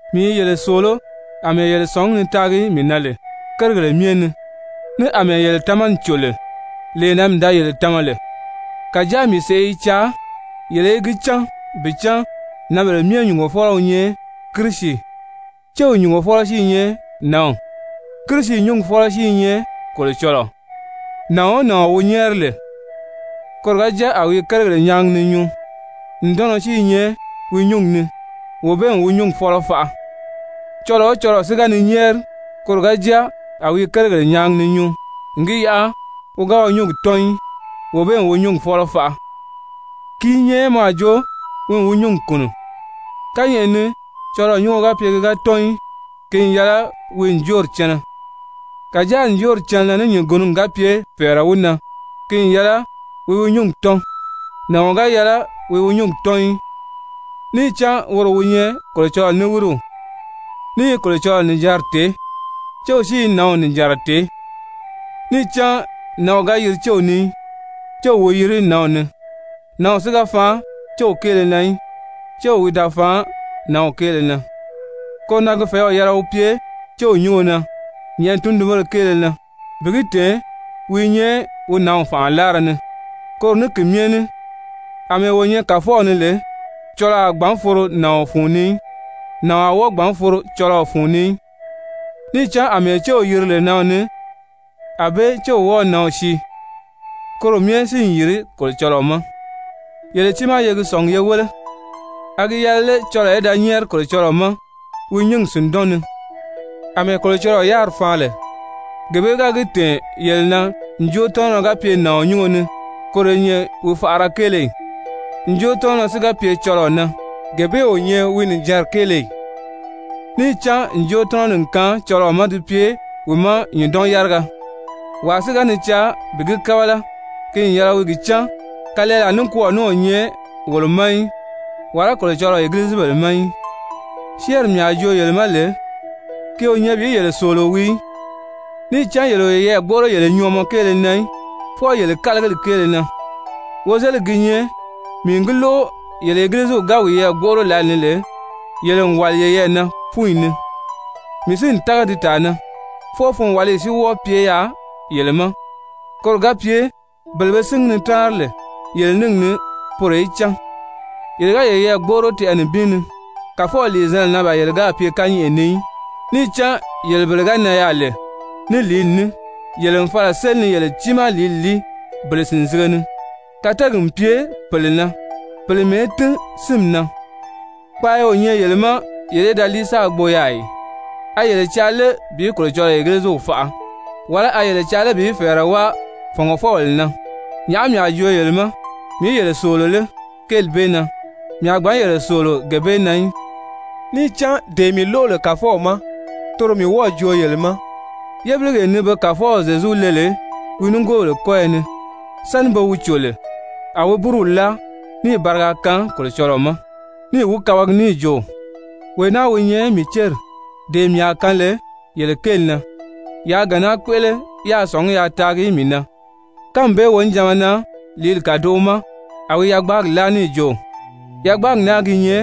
Mii i yele sòoló àmɛɛ yele sɔ̀ngí ni taagi mii na lè kérigèle myɛ ni, ní àmɛɛ yele tamani cò lè lee na mii da yele tama lè. Kàjáa mii sèʔé i caa yele í gi cán bi cán nǎnbèle myɛ nyùngofɔlɔ wi nyɛ Kirisi, céw nyùngofɔlɔ si i nyɛ nǎnw, Kirisi nyúngi fɔ́lɔ si i nyɛ Kolocɔlɔɔ. Nàɔn o nàɔn wi nyɛ́ɛri lè, koro ga jáa a wi i kérigèle nyaagi ni nyuu ǹdɔnnɔ si i nyɛ wi nyúngi ni, wee bee n wi nyúngi fɔ́lɔ faʔa. Cɔlɔɔ o cɔlɔɔ si ga ni nyɛ́ɛri, koro ga jáa a wi i kérigèle nyaagi ni nyuu n gi yaʔa wi ga wi nyúngi tɔ́n í, wee bee n wi nyúngi fɔ́lɔ faʔa, ki i nyɛ mɔ a jo wi n wi nyúngi kùnu. Kányɛʔɛ ni cɔlɔɔ nyúngo ga pye ki ga tɔ́n í, ki n yɛlɛ wi wi ǹjoori cɛnɛ. Kàjáa ǹjoori cɛnɛnɛ ní nyùngunugi ga pye fɛ̀ɛrɛ wi na, ki n yɛlɛ wi wi nyúngi tɔ́n. Nàɔn ga yɛlɛ wi wi nyúngi tɔ́n í, níì cán woro wi nyɛ Kolocɔlɔɔ niwiriw, ní i Kolocɔlɔɔ nìjanri tèé, céw si i nǎnw nìjanra tèé. Níì cán nǎnw ga yiri céw ni í, céw wi yiri nǎnw ni. Nǎnw si da faan céw kéele na í, céw wi da faan nǎnw kéele na. Koro na ki fɛ̀ɛ́w yɛlɛ wi pye céw nyúngo na nyɛ̀ʔɛni tundunbéle kéele na bi gi tɛ̀ɛn wi i nyɛ wi nǎnw fànʔa láara ni. Koro ní ki myɛ ní àmɛɛ wo nyɛ Kàfɔw ni lè cɔlɔɔ a gbǎn foro nàɔn fun ni í, nàɔn a wɔ́ɔ gbǎn foro cɔlɔɔ fun ni í. Níì cán àmɛɛ céw yiri lè nǎnw ni, ànbée céw wɔ́ɔ̄ nǎnw sii, koro myɛ si n yìri Kolocɔlɔɔ ma. Yele tiimaa ye gi sɔ̀ngi ye wéle, a gi yɛlɛ lé cɔlɔɔ í da nyɛ́ɛri Kolocɔlɔɔ ma wi nyúngi sìndɔn ni? Amɛɛ Kolocɔlɔɔ yáriri faan lè, gee bee ga gi tɛ̀ɛn yele na ǹjootɔnɔrɔ ga pye nàɔn nyúngo ni, koro i nyɛ wi faʔara kéele ì? Njootɔnɔrɔ si ga pye cɔlɔɔ na, gee bee o nyɛ wi nìjanri kéele ì? Níì cán ǹjootɔnɔri n kaan cɔlɔɔ ma di pye wi ma nyùndɔn-yáriga. Wàa si ga ni caa bi gi kábala, ki n yɛlɛ wi gi cán kalɛɛlaa nikwɔɔ ní o nyɛ wolo ma í, wàlá Kolocɔlɔɔ egilizibèle ma í. Syɛ́ɛnri mii a joo yele ma lè, ki o nyɛ bi yele sòolo wii í, níì cán yele o yeyɛɛ gbóʔoro yele nyɔɔmɔ kéele na í, fwɔɔ yele kálagili kéele na. Wozeligi gi nyɛ mii n gi lóʔo yele Egiliziw ga wiyɛɛ gbóʔoro lǎlee ni lè, yele n wàli yeyɛɛ na fúnyi ni, mii si n tága di tàa na. Fwɔɔ funwaliyi si wɔ́ɔ pye yaà yele ma, koro ga pye bele be síngi ni táanri lè yele níngi ni, poro í cán. Yele ga yeyɛɛ gbóʔoro tɛʔɛ nibin ni, Kàfɔw lìizanna na ban yele gáà pye kányɛʔɛ ni í. Níì cán yele bele ga nan yaà lè ní lìíli ní, yele n fala n séli ni yele tiimaa lìíli líi bele sìnzige ni, kateegi n pye pèle na, pèle mɛ̀ɛ́ tín sínmi na. Kpaaya o nyɛ yele ma yele í da líi sáā gbo yaà ì? A yele i caa lé bi Kolocɔlɔɔ Egiliziw faʔa? Wàlá a yele i caa lé bi fɛ̀ɛrɛ wáa fɔ̀ngɔfɔbèle na? Nyàʔá mii a joo yele ma? Mii í yele sòolo lé kéeli bee na? Mii a gbǎn yele sòolo gee bee na í. Níì cán dee mii lóʔo lè Kàfɔw ma, toro mii wɔ́ɔ̀ joo yele ma. Yébiligee ni pe Kàfɔw Zyezu le lè wi nigoobèle kɔ́yɔ ni, sáni be wi cò lè a wi búruw láa níì bariga kaan Kolocɔlɔɔ ma níì wi kabagi níì jo: «Wee naa wi nyɛ mii céri, dee mii a kaan lè yele kéeli na. Yaa gee naa kpéʔele yáā sɔ̀ngí yaa taagi mii na.» Kánmi bee wonijanma na, lìíli kàdoʔo ma, a wi yagbaagi láa níì jo: «Yagbaagi naa gi nyɛ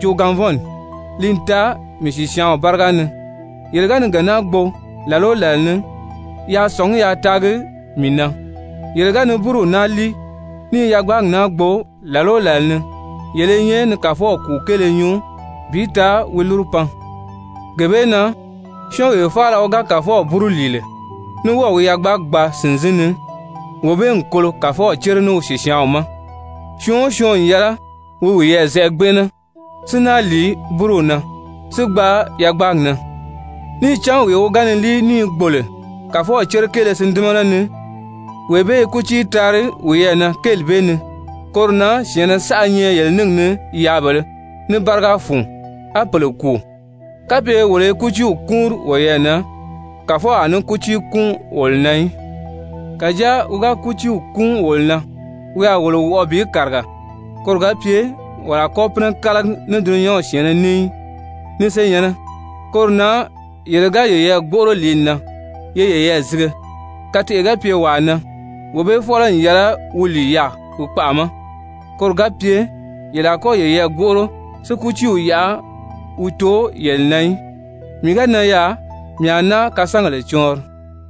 joogaanvɔnni, li n taa mii sìsyaanw báriga ni. Yele ga ni gee naa gbo làla o làla ni, yaa sɔ̀ngí yaa taagi mii na.» Yele ga ni búruw naa líi, ní i yagbaagi naa gbo làla o làla ni, yele i nyɛ ni Kàfɔw kùu kéele nyuu bi taa wi lúru pan. Gee bee na syɔ́ɔnwee faala wi ga Kàfɔw búru lìi lè, ní wɔ́ɔ̀ wi yagbaagi gbaa sìnzin ni, wee bee n kolo Kàfɔw cére ní wi sìsyaanw ma. Syɔɔn o syɔɔn n yɛlɛ wi wiyɛɛ zɛʔɛ gbɛnʔɛnɛ si náa lìi búruw na, si gbaa yagbaagi na. Níì cán wee wi ga ni líi ní i gbo lè Kàfɔw cére kéele sìndimana ni, wee bee i kútii taari wiyɛɛ na kéeli bee ni. Koro na syɛ̀ɛnnɛ saʔa nyɛ yele níngi ni yaabèlē, ní báriga fun, á pèle kùu. Kapye wolo i kútiiw kúunri woyɛɛ na, Kàfɔw a ní kútii kúun wolo na í. Kàjáa wi ga kútiiw kúun wolo na, wi a wolo wɔʔɔ bi kàriga, koro ga pye wolo a kɔ́ pínɛ kálagi ní dulunyanw syɛ̀ɛnnɛ ní í. Ni senyɛ̀nnɛ, koro na yele ga yeyɛɛ gbóʔoro lìíli na, ye yeyɛɛ zige. Kateʔe ga pye wàa na, wee bee fɔ́lɔ n yɛlɛ wi lìi yaà wi kpaʔa ma, koro ga pye yele a kɔ́ yeyɛɛ gbóʔoro si kútiiw yaʔa wi too yele na í. Mii ga nan yaà, mii a náa kasangèle cɔɔnri.